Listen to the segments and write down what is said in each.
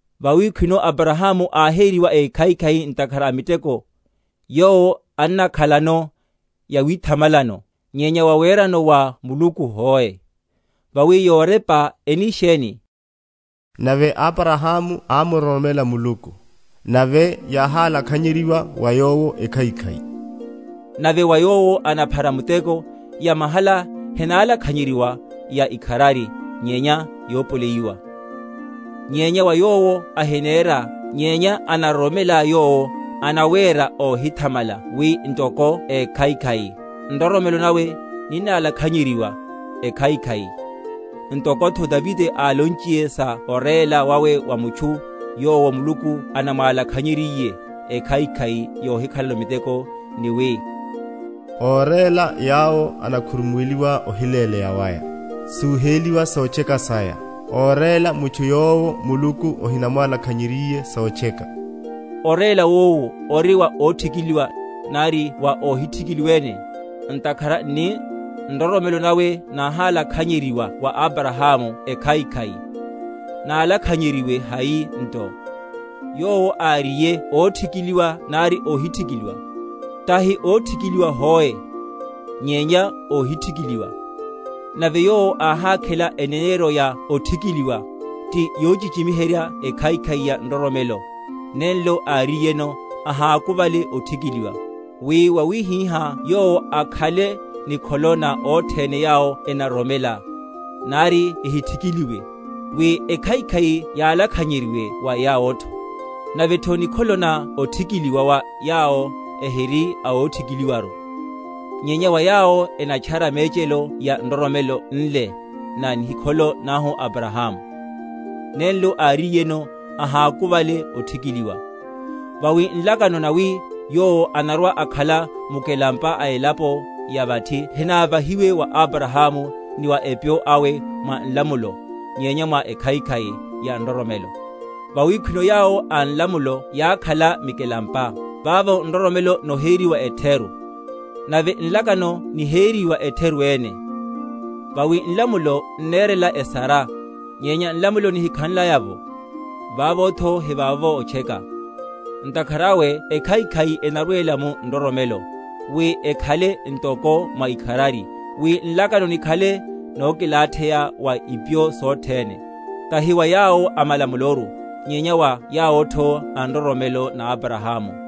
Vawi khwino Abrahamu áhériwa ékhaikhai ntakhara a miteko, yowo annakhalano yawithamalano; nyenya wawerano wa Muluku hoe. Vawi yorepa eni sheni? Nave Abrahamu ámuroromela Muluku, nave yáhálakhanyeryiwa wa yowo ekhaikhai. Nave wa yowo anaphara muteko, yamahala henalakhanyeryiwa ya ikharari nyenya yopoleyiwa. Nyenya wa yowo ahinera, nyenya anaroromela Yowo anawéra óhithamala wi ntoko ékhaikhai, nroromelo nawe ninnalakhanyeryiwa ekhaikhai. Ntokotho Davide álonchiye sa oréla wawe wa mutchu, yowo Muluku anamwalakhanyeryiye ekhaikhai yohikhalano miteko, ni wi, Óréla yawo enakhurumuweliwa ohileleya waya, Súhéliwa sotcheka saya, Óréla mutchu yowo Muluku ahinamwalakhanyeryiye sotcheka. Oréla wowu nto ori wa óthikiliwa, nari wa óhithikiliwa ene? Ntakhara nni, Nroromelo nawe náhálakhanyeryiwa wa Abrahamu ekhaikhai. Nálakhanyeryiwe hai nto? Yowo áriye óthikiliwa nari óhithikiliwa? Tahi óthikiliwa hoe, nyenya óhithikiliwa; nave yowo áhákhela eneneryo ya othikiliwa, ti yochichimiherya ekhaikhai ya nroromelo, nenlo áriyeno ahákuvale othikiliwa; wi wawihihá yowo akhale nikholo na othene yawo enaroromela, nari ehithikiliwe, wi ekhaikhai yálakhanyeryiwe wa yawotho; navetho nikholo na othikiliwa wa yawo ehiri a othikiliwaru, nyenya wa yawo enatchara mechelo ya nroromelo nle na nikholo nahu Abrahamu, nenlo áriyeno ahákuvale othikiliwa. Vawi nlakano nawi yowo anarwa‐akhala mukelampa a elapo ya vathi henávahiwe wa Abrahamu ni wa epyo awe mwa nlamulo, nyenya mwa ekhaikhai ya nroromelo. Vawi khwino yawo a nlamulo yákhala mikelampa, vavo nroromelo noheriwa etheru, nave nlakano niheriwa etheru ene; vawi nlamulo n’nerela esara; nyenya nlamulo nihikhanlaya’vo, vavotho hivavovo otcheka. Ntakhara awe ekhaikhai enarwela mu nroromelo, wi ekhale ntoko mwa ikharari; wi nlakano nikhale nokilatheya wa ipyo sothene; tahi wa yawo a malamuloru, nyenya wa yawotho a nroromelo na Abrahamu: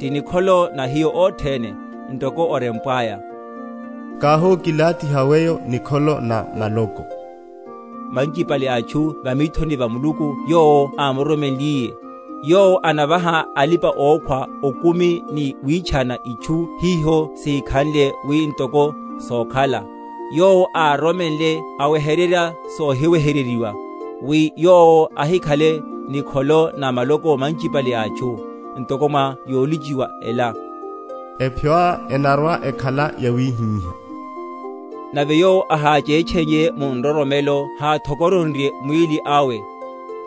ti nikholo na hiyo othene; ntoko orempwaya: Káhokilathiha weyo nikholo na maloko manchipale a atchu va mithoni va Muluku Yowo ámuroromenliye, yowo anavaha alipa‐okhwa okumi, ni witchana itchu hiho sihikhanle, wi ntoko sókhala. Yowo ároromenle awehererya sohiwehereryiwa, wi yowo ahikhale nikholo na maloko manchiene a atchu, ntoko mwa yolochiwa ela, Epyoá enarwa‐ekhala yawihiha. Nave yowo aháchetcheiye mu nroromelo háthokoronrye mwíli awe,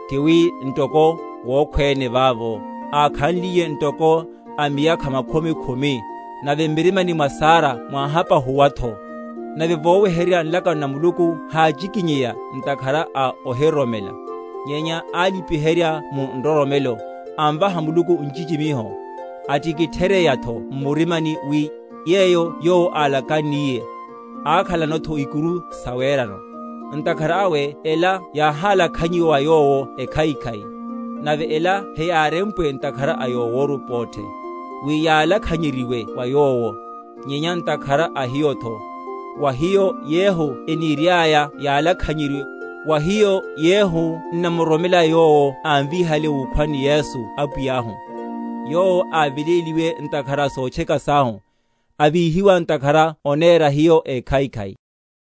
ti wi ntoko wókhwene vavo, (ákhanliye ntoko a miyakha makhumi khumi), nave m’mirimani mwa Sara mwáhapahuwatho; nave vowehererya nlakano na Muluku háchikinyeiya ntakhara a ohiroromela, nyenya álipiherya mu nroromelo, amvaha Muluku nchichimiho, atikitheryeyatho m’murimani wi, yeyo Yowo álakanniye, ákhalanotho ikuru sawerano. Ntakhara awe ela yáhálakhanyiwa wa yowo ekhaikhai. Nave ela heyárempwe ntakhara a yoworu pothe, wi yálakhanyeryiwe wa yowo; nyenya ntakhara a hiyotho, wa hiyo yehu eniriaya yálakhanyeryiwe, wa hiyo yehu n’namuroromela Yowo ámvíhale wukhwani Yesu Apwiyahu, Yowo áveléliwe ntakhara a sotcheka sahu, avíhiwa ntakhara onéra hiyo ékhaikhai.